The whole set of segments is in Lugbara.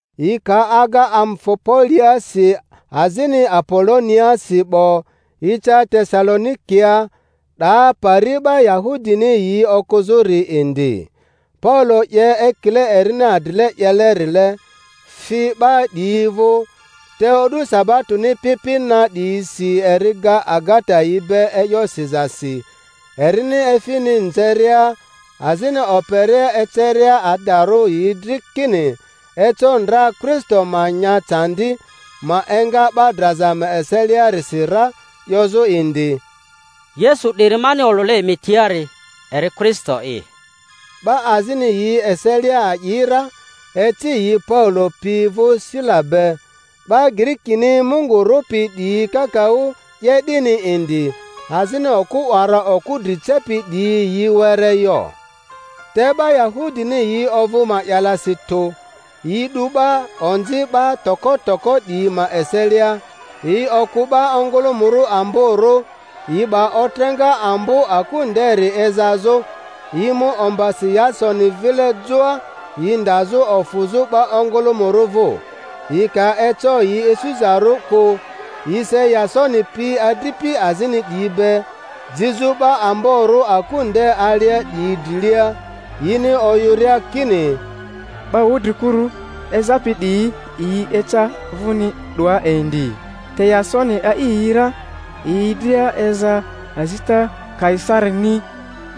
Yi ka aga Amfipoliasi azini Apoloniaasi 'bo, yi ca Tesalo-nikia, 'daa pari 'ba Yahudini yi okᴜzᴜri indi. Paulo 'ye ekile erini adrile 'yelerile, fi 'ba 'diyi vᴜ, te o'du sabatoni pi pi na 'diyisi eri ga agata yi be e'yo sizasi, erini efini nzeria azini operia eceria adarᴜ yi dri kini eco ndra Kristo ma nya candi, ma enga 'ba draza ma eseliarisi ra, 'yozᴜ indi, Yesu 'diri mani olᴜle emi tiari eri Kristo'i. 'Ba azini yi eselia a'i ra, eci yi Paulo pi vᴜ Sila be; 'ba Girikini Mungu rᴜpi 'diyi kakaᴜ 'ye 'dini indi, azini okᴜ 'wara okᴜ dri cepi 'diyi yi were yo. Te 'ba Yahudini yi ovᴜ ma'yalasi tᴜ, yi 'du 'ba onzi 'ba toko toko 'diyi ma eselia, yi okᴜ 'ba ongᴜlᴜmᴜrᴜ amborᴜ, yi 'ba otreŋa ambo aku nderi ezazᴜ, yi mu ombasi Yasoni vile joa, yi ndazᴜ ofᴜzᴜ 'ba ongᴜlᴜmᴜrᴜ vᴜ. Yi ka eco yi isuzarᴜ kᴜ, yi se Yasoni pi adripi azini 'diyi be, jizᴜ 'ba amborᴜ aku nde alia 'diyi drilia, yini oyᴜria kini, 'Ba wudri-kuru ezapi 'diyi yi eca vuni 'doa indi, te Yasoni a'i yi ra; yi dria eza azita Kaisarini,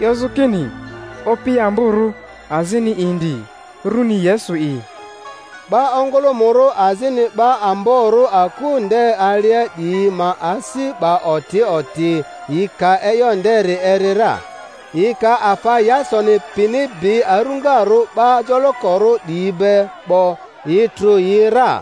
'yozᴜ kini opi amborᴜ azini indi, rᴜni Yesu'i. 'Ba ongᴜlᴜmᴜrᴜ azini 'ba amborᴜ aku nde alia 'diyi ma asi 'ba oti oti yi ka e'yo nderi eri ra. Yi ka afa Yasoni pini bi aruŋarᴜ 'ba jolokorᴜ 'diyi be 'bo, yi trᴜ yi ra.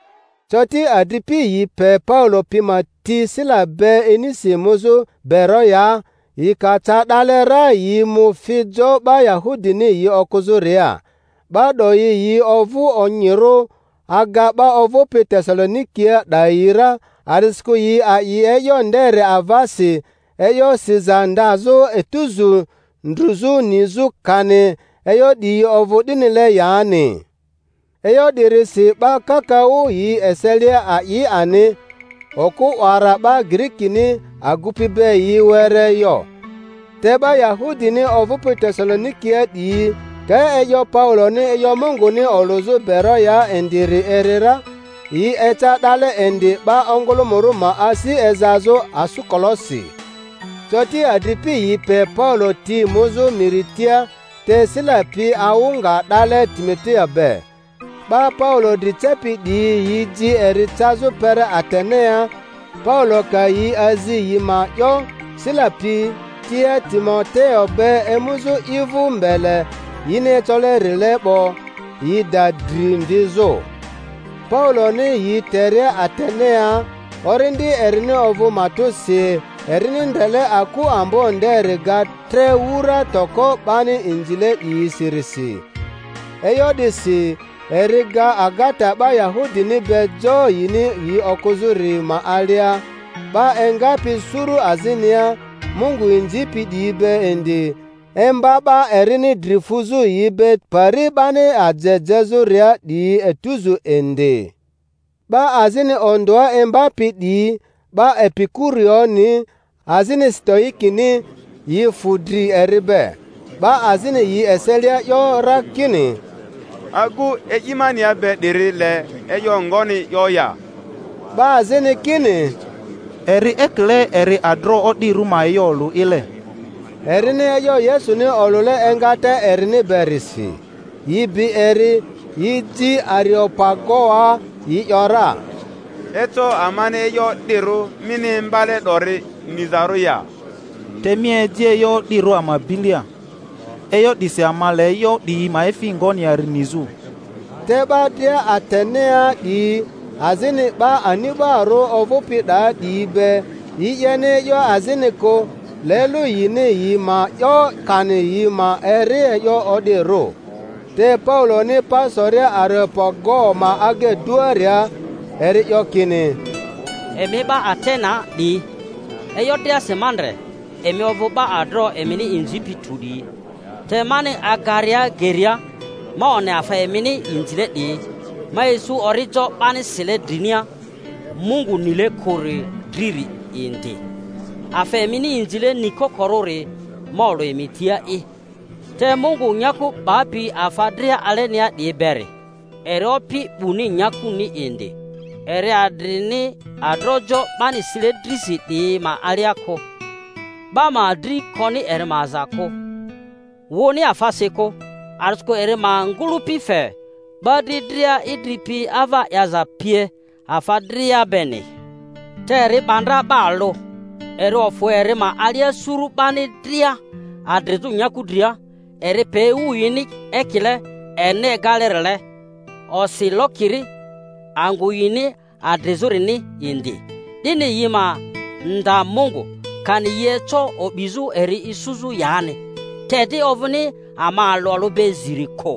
Coti adripi yi pe Paulo pi ma ti Sila be inisi muzᴜ Beroyaa; yi ka ca 'dale ra yi mu fi jo 'ba Yahudini yi okᴜzᴜria. 'Ba 'doyi yi ovᴜ onyirᴜ aga 'ba ovᴜpi Tesalonikia 'dayi ra, a'disikᴜ yi a'i e'yo nderi avasi e'yo siza ndazᴜ etuzu, ndruzᴜ nizᴜ kani e'yo 'diyi ovᴜ 'dinile yani. E'yo 'dirisi 'ba kakaᴜ yi eselia a'i ani, okᴜ 'wara 'ba Girikini agupi be yi were yo. Te 'ba Yahudini ovᴜpi Tesalonikia 'diyi ka e'yo Pauloni e'yo Munguni olᴜzᴜ Beroyaa indiri eri ra, yi eca 'dale indi 'ba ongᴜlᴜmᴜrᴜ ma asi ezazᴜ asᴜkolosi. Coti adripi yi pe Paulo ti muzᴜ miri tia, te Sila pi awᴜ nga 'dale Timoteo be. 'Ba Paulo dri cepi 'diyi yi ji eri cazᴜ kpere Atenea; Paulo ka yi azi yi ma 'yo Sila pi tia Timoteo be emuzᴜ i vᴜ mbele yini ecolerile 'bo, yi da dri mvizᴜ. Pauloni yi teria Atenea, orindi erini ovᴜ matᴜsi erini ndrele aku ambo nderi ga tre wura toko 'bani inzile 'diyisirisi. E'yo 'disi eri ga agata 'ba Yahudini be jo yini yi okᴜzᴜri ma alia, 'ba engapi suru azinia Mungu inzipi 'diyi be indi, imba 'ba erini dri fᴜzᴜ yi be pari 'bani aje jezᴜria 'diyi etuzu indi. 'Ba azini ondᴜa imbapi 'diyi, 'ba Epikurioni azini Sitoikini, yi fᴜ dri eri be. 'Ba azini yi eselia 'yo ra kini, Agu e'imania be 'diri le e'yo ngoni 'yo ya? 'Ba azini kini, Eri ekile eri adroᴜ o'dirᴜ ma e'yo olᴜ'ile. —erini e'yo Yesuni olᴜle engata erini berisi. Yi bi eri, yi ji Areopagoa, yi ‘yora, Eco amani e'yo o'dirᴜ mini imbale 'dori nizarᴜ ya? Te mi eji e'yo o'dirᴜ ama bilia; e'yo 'disi ama le e'yo 'diyi ma efi ngoni yari nizᴜ. Te 'ba dria Atenea 'diyi, azini 'ba ani'barᴜ ovᴜpi 'daa 'diyi be, yi 'yeni e'yo azini kᴜ, le lᴜ yini yi ma 'yo kani yi ma eri e'yo o'dirᴜ. Te Pauloni pa soria Areopago ma agaduaria, eri 'yo kini: Emi 'ba Atenea 'diyi, e'yo driasi ma ndre emi ovᴜ 'ba adroᴜ emini inzipi tᴜ 'diyi. Te mani agaria geria ma one afa emini inzile 'diyi, ma isu orijo 'bani sile drinia, MUNGU NILE KURI DRI-ri indi. Afa emini inzile nikokorᴜri ma olᴜ emi tia'i. Te Mungu nyaku 'bapi afa dria alenia 'diyi beri, eri Opi 'buni nyakuni indi, eri adrini adroᴜjo 'bani sile drisi 'diyi ma alia kᴜ; 'ba ma dri koni eri ma aza kᴜ, wᴜni afasi kᴜ, a'disikᴜ eri ma ngᴜ-lᴜpi fe 'ba dri dria idri pi, ava 'yaza pie, afa dria beni. Te eri 'ba ndra 'ba alᴜ, eri ofᴜ eri ma alia suru 'bani dria adrizᴜ nyaku dria, eri pe ewu yini ekile erini egalerile, osi lokiri angᴜ yini adrizᴜrini indi; 'dini yi ma nda Mungu, kani yi eco o'bizᴜ eri isuzᴜ yani. Te di ovᴜni ama alᴜ alᴜ be ziri kᴜ,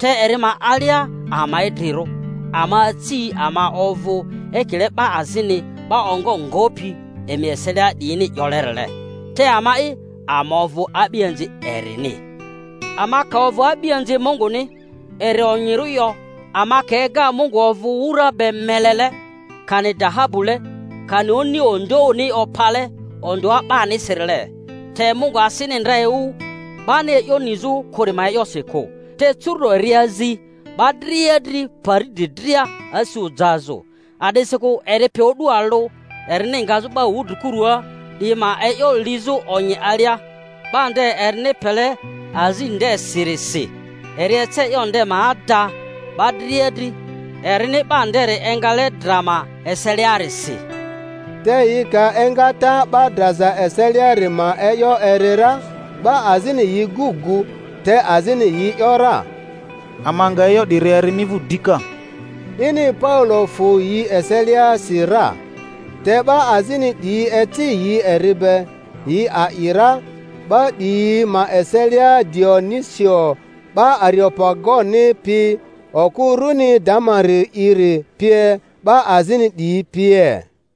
te Eri ma alia ama idrirᴜ, ama aci, ama ovᴜ; ekile 'ba azini 'ba ongo ngopi emi eselia 'diyini 'yolerile, Te ama'i, ama ovᴜ a'bianzi erini. Ama ka ovᴜ a'bianzi Munguni, eri onyirᴜ yo ama ka ega Mungu ovᴜ wura be melele, kani dahabule, kani oni ondᴜoᴜni opale ondᴜa 'banisirile. Te Mungu asini ndra ewu 'bani e'yo nizᴜ kᴜri ma e'yosi kᴜ, te curu'do eri azi 'ba dria dri pari dri dria asi ojazᴜ, a'disikᴜ eri pe o'du alᴜ erini ngazᴜ 'ba wudrikuru 'diyi ma e'yo lizᴜ onyi alia, 'ba nde erini pele azi ndesirisi. Eri ece e'yo nde ma ada 'ba dria dri, erini 'ba nderi engale dra ma eseliarisi. Te yi ka engata 'ba draza eseliari ma e'yo eri ra, 'ba azini yi gu gᴜ, te azini yi ‘yora, Ama nga e'yo 'diri eri mi vᴜ dika. 'Dini Paulo fᴜ yi eseliasi ra. Te 'ba azini 'diyi eci yi eri be, yi a'i ra; 'ba 'diyi ma eselia Dionisio 'ba Areopagoni pi, okᴜ runi Damari'iri pie, 'ba azini 'diyi pie.